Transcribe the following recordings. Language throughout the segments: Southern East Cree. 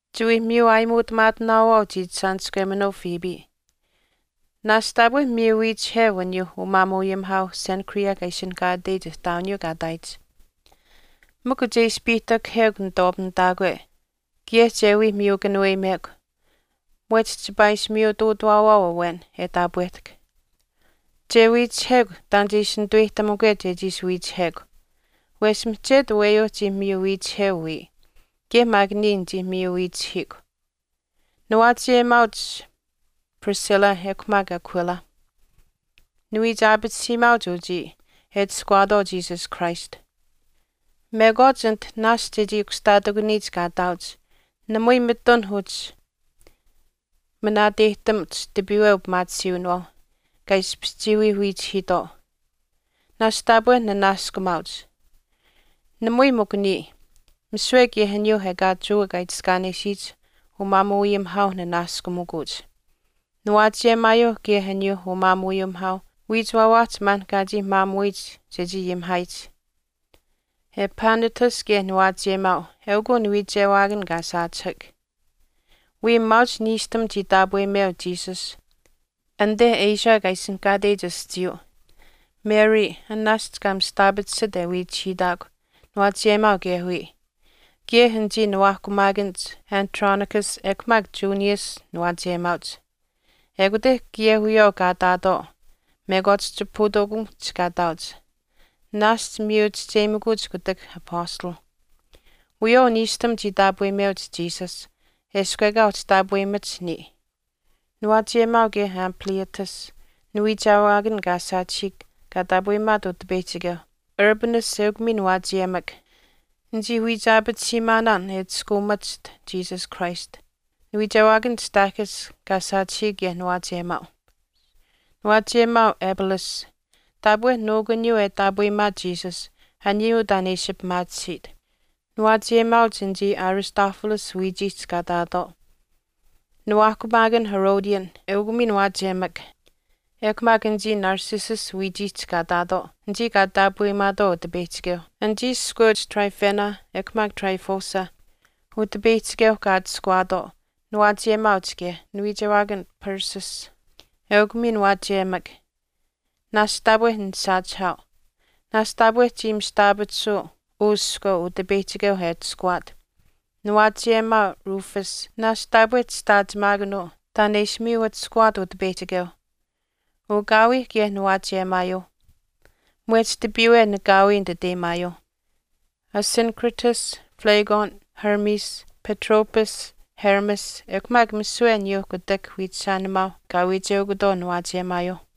Chiwii miyu aayimuutamaatinaawaau chiichishaaniskweminuu Phoebe. Naashch taapwe miyu wiichiheu aniyuuh umaamuuayimihaauh Cenchreae kaa ishinihkaateyich ihtaawiniyuu kaa ihtaayich. Mikw che ishi piihtakahekw nituwaapamitaakwe kaye che wii miyu kanuweyimekw mwehch chipaa ishi miyutuutawaawaau awen e taapwehtahk. Che wiichihekw taan che ishi nituweyihtamukwe chechii ishi wiichihekw. Wesh mihchet aweyuuh chii miyu wiichiheu wiya. Kaye maak niya nichii miyu wiichihiikw. Niwaachiyemaauch Priscilla ekw maak Aquila. Niwiichaapatisiimaauch uchii e atushkuwaatwaau Jesus Christ. Mekwaach anit naashch e chii kushtaatikuniyich kaa ihtaauch namui mitun uhchi manaateyihtamuch tipiiwe upimaatisiiwinawaauh kaa ishpish chii wii wiichihiitwaau. Naashch taapwe ninanaaskumaauch. Namui mikw niya, misiwe kaye aniyuuh ekaa Jewa kaa itiskaanesiyich umaamuuayimihaauh nanaaskumikuuch. Niwaachiyemaayuuh kaye aniyuu umaamuuayimihaauh uwiichiwaawaahch maan kaa chii maamuyich chechii ayimihaayich. Epaenetus kaye niwaachiyemaau eukuu niwiichewaakan kaa saachihak. Wiya maauch niishtam chii taapweyimeu Jesus anite Asia kaa ishinihkaateyich aschiiyuu. Mary an naashch kaa mistaapatisit e wiichihiitaakw niwaachiyemaau kaye wiya. Kaye anichii niwaahkumaakanich Andronicus ekw maak Junias niwaachiyemaauch. Ekute kaye wiyawaau kaa ihtaatwaau mekwaach chipahutuukamikuhch kaa ihtaauch. Naashch miyu chisteyimikuuch kutak apastalh. Wiyawaau niishtam chii taapweyimeuch Jesus eshkw ekaa uhchi taapweyimach niya. Niwaachiyemaau kaye Ampliatus, niwiichewaakan kaa saachihiik kaa taapweyimaat Utipeyihchikeuh. Urbanus eukw miin waachiyemak. Nichii wiichaapatisiimaanaan e atushkaamachiht Jesus Christ. Niwiichewaakan Stachys naashch kaa saachihiik kaye niwaachiyemaau. Niwaachiyemaau Apelles. Taapwe nuukuniyuu e taapweyimaat Jesus aniyuu taan e ishi pimaatisit. Niwaachiyemaauch anichii Aristobulus wiichiihch kaa ihtaatwaau. Niwaahkumaakan Herodion, eukw miin waachiyemak, ekw maak anichii Narcissus wiichiihch kaa ihtaatwaau anichii kaa taapweyimaatwaau Utipeyihchikeuh. Anichii iskweuch Tryphaena ekw maak Tryphosa Utipeyihchikeu kaa atuskwaatwaau, niwaachiyemaauch kaye. Niwiichewaakan Persis, eukw miin waachiyemak, naashch taapwe nisaachihaau. Nasch taapwe chii mista aapatisuu uu iskweu Utipeyihchikeu e atushkuwaat. Niwaachiyemaau Rufus, naashch taapwe chishtaachimaakanuu taan e ishi miyu atushkuwaat Utipeyihchikeu. Ukaawii kaye niwaachiyemaayuu. Mwehch tipiiwe nikaawii nititeyimaayuu. Asyncritus, Phlegon, Hermes, Patrobas, Hermas ekw maak misiwe aniyuuh kutak wiichishaanimaauh kaa wiicheukutwaau niwaachiyemaauch.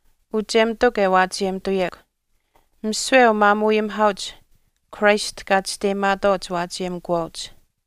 Chiyawaau kaa wiichishaanihtuyekw uchemitukw e waachiyemituyekw. Misiwe umaamuuayimihaauch Christ kaa chisteyimaatwaau chiwaachiyemikuwaauch.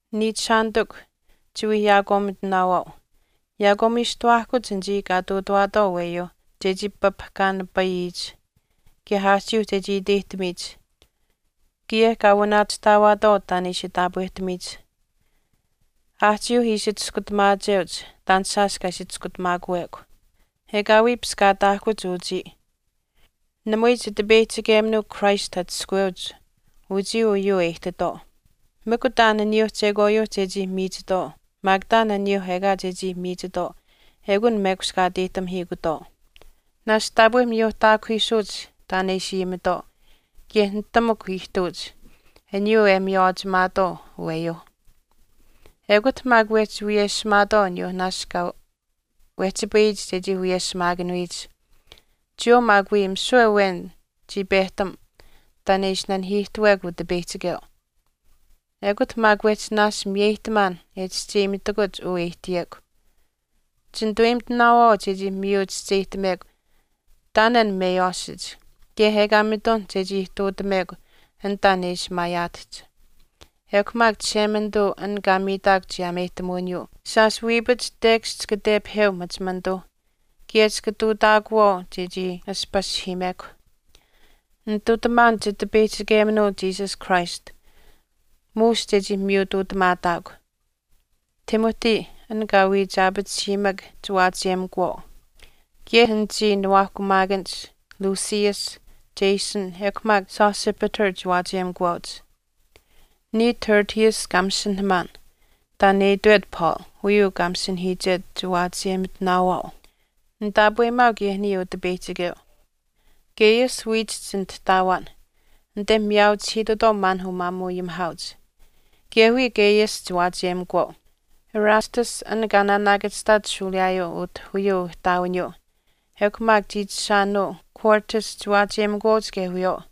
Niichishaanitikw, chiwii yaakwaamitinaawaau. Yaakwaamiistuwaahkuch anichii kaa ihtuutawaatwaau aweyuuh chechii papahkaanipayiyich kaye aahchiiuh chechii iteyimituyich kaye kaa wanaachihtaawaatwaau taan e ishi taapwehtamiyich. Aahchiiuh ishi chiskutamaacheuch taan shaash kaa ishi chiskutamaakuwekw. Ekaawii piskaataahkuch uchii. Namui Chitipeyihchikeminuuh Christ atushkuweuch uchii uyuu e ihtitwaau, mikw taan aniyuuh chekwaayuuh chechii miichitwaau maak taan aniyuuh ekaa chechii miichitwaau eukunh mekushkaateyihtamihiikutwaau. Naashch taapwe miyuuhtaakuhiisuuch taan e ishi ayimitwaau kaye nitamukw ihtuuch aniyuu e miywaachimaatwaau aweyuu. Ekut maak wehchi wiyeshimaatwaau aniyuuh naashch kaa wehchipayihch chechii wiyeshimaakanuyich. Chiyawaau maak wii misiwe awen chii pehtam taan e ishi nanihiihtuwekw Utipeyihchikeu. Ekut maak wehchi naashch miyeyihtamaan e chischeyimitakuch uu e ihtiyekw. Chinituweyimitinaawaau chechii miyu chischeyihtamekw taan an meywaashich kaye ekaa mitun chechii ihtuutamekw an taan e ishi maayaatahch. Ekw maak Chishemanituu an kaa miitahkw chiyaameyihtamuwiniyuu shaash wiipach tekash chika tepaheu machimanituuh kaye chika ihtuutaakuwaau chechii ashpashihiimekw. Nitutamaan Chitipeyihchikeminuu Jesus Christ muush chechii miyutuutamaataakw. Timothy an kaa wiich aapatisiimak chiwaachiyemikuwaau. Kaye anichii nuwaahkumaakanich Lucius, Jason, ekw maak Sosipater chiwaachiyemikuwaauch. Niya Tertius, kaa masinahamaan taan e itwet Paul uyuu kaa masinahiichet chiwaachiyemitinaawaau. Nitaapweyimaau kaye niya Utipeyihchikeu. Gaius wiichihch nitihtaawaan anite miyaauchihiitutwaau maan umaamuuayimihaauch. Kaye wiya Gaius chiwaachiyemukuwaau. Erastus, an kaa naanaakachihtaat shuuliyaayuu utah uyuu ihtaawiniyuu ekw maak chiichishaanuu Quartus chiwaachiyemikuwaauch kaye wiyawaau.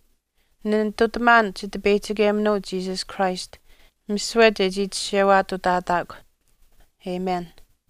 Ninitutamaan Chitipeyihchikeminuu Jesus Christ misiwe chechii chishewaatutaataakw. Amen.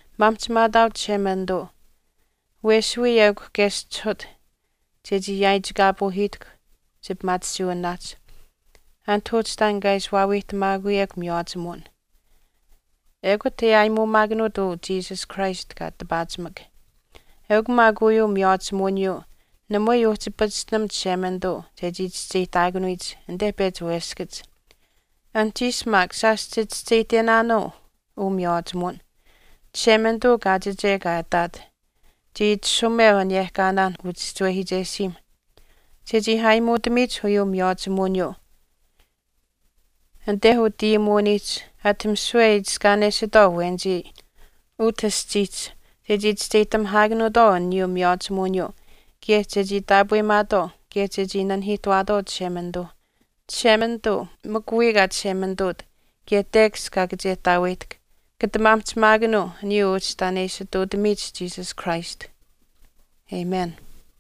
Maamihchimaataau Chishemanituu. Wes wiya eukw keschihut chechii yaaichikaapuuhiitaakw chipimaatisiiwiniwaahch anit uhchi taan kaa ishi waawiihtamaatakuch miywaachimuwin. Ekut e aayimuumaakanuut uu Jesus Christ kaa tipaachimak. Eukw maak uyuu miywaachimuwiniyuu namui uhchi pachishtinam Chishemanituu chechii chischeyihtaakanuyich anite pechi weskach. Anuhchiish maak shaash chichischeyihtenaanuu uu miywaachimuwin. Chishemanituu kaachiche kaa ihtaat chii itashumeu aniyehkaanaanh uchischiwehiichesiimh chechii aayimuutamiyich uyuu miywaachimuwiniyuu anite utayimuwiniihch ati misiwe e itiskaanesitwaau awenichii utah aschiihch chechii chischeyihtamihaakanuutwaau aniyuu miywaachimuwiniyuu kaye chechii taapweyimaatwaau kaye chechii nanihiihtuwaatwaau Chishemanituu. Chishemanituu mikw wiya kaa Chishemanituut kaye tekash kaa kachehtaaweyihtahk, kata maamihchimaakanuu aniyuu uhchi taan e ishi ihtuutamiyich Jesus Christ. Amen.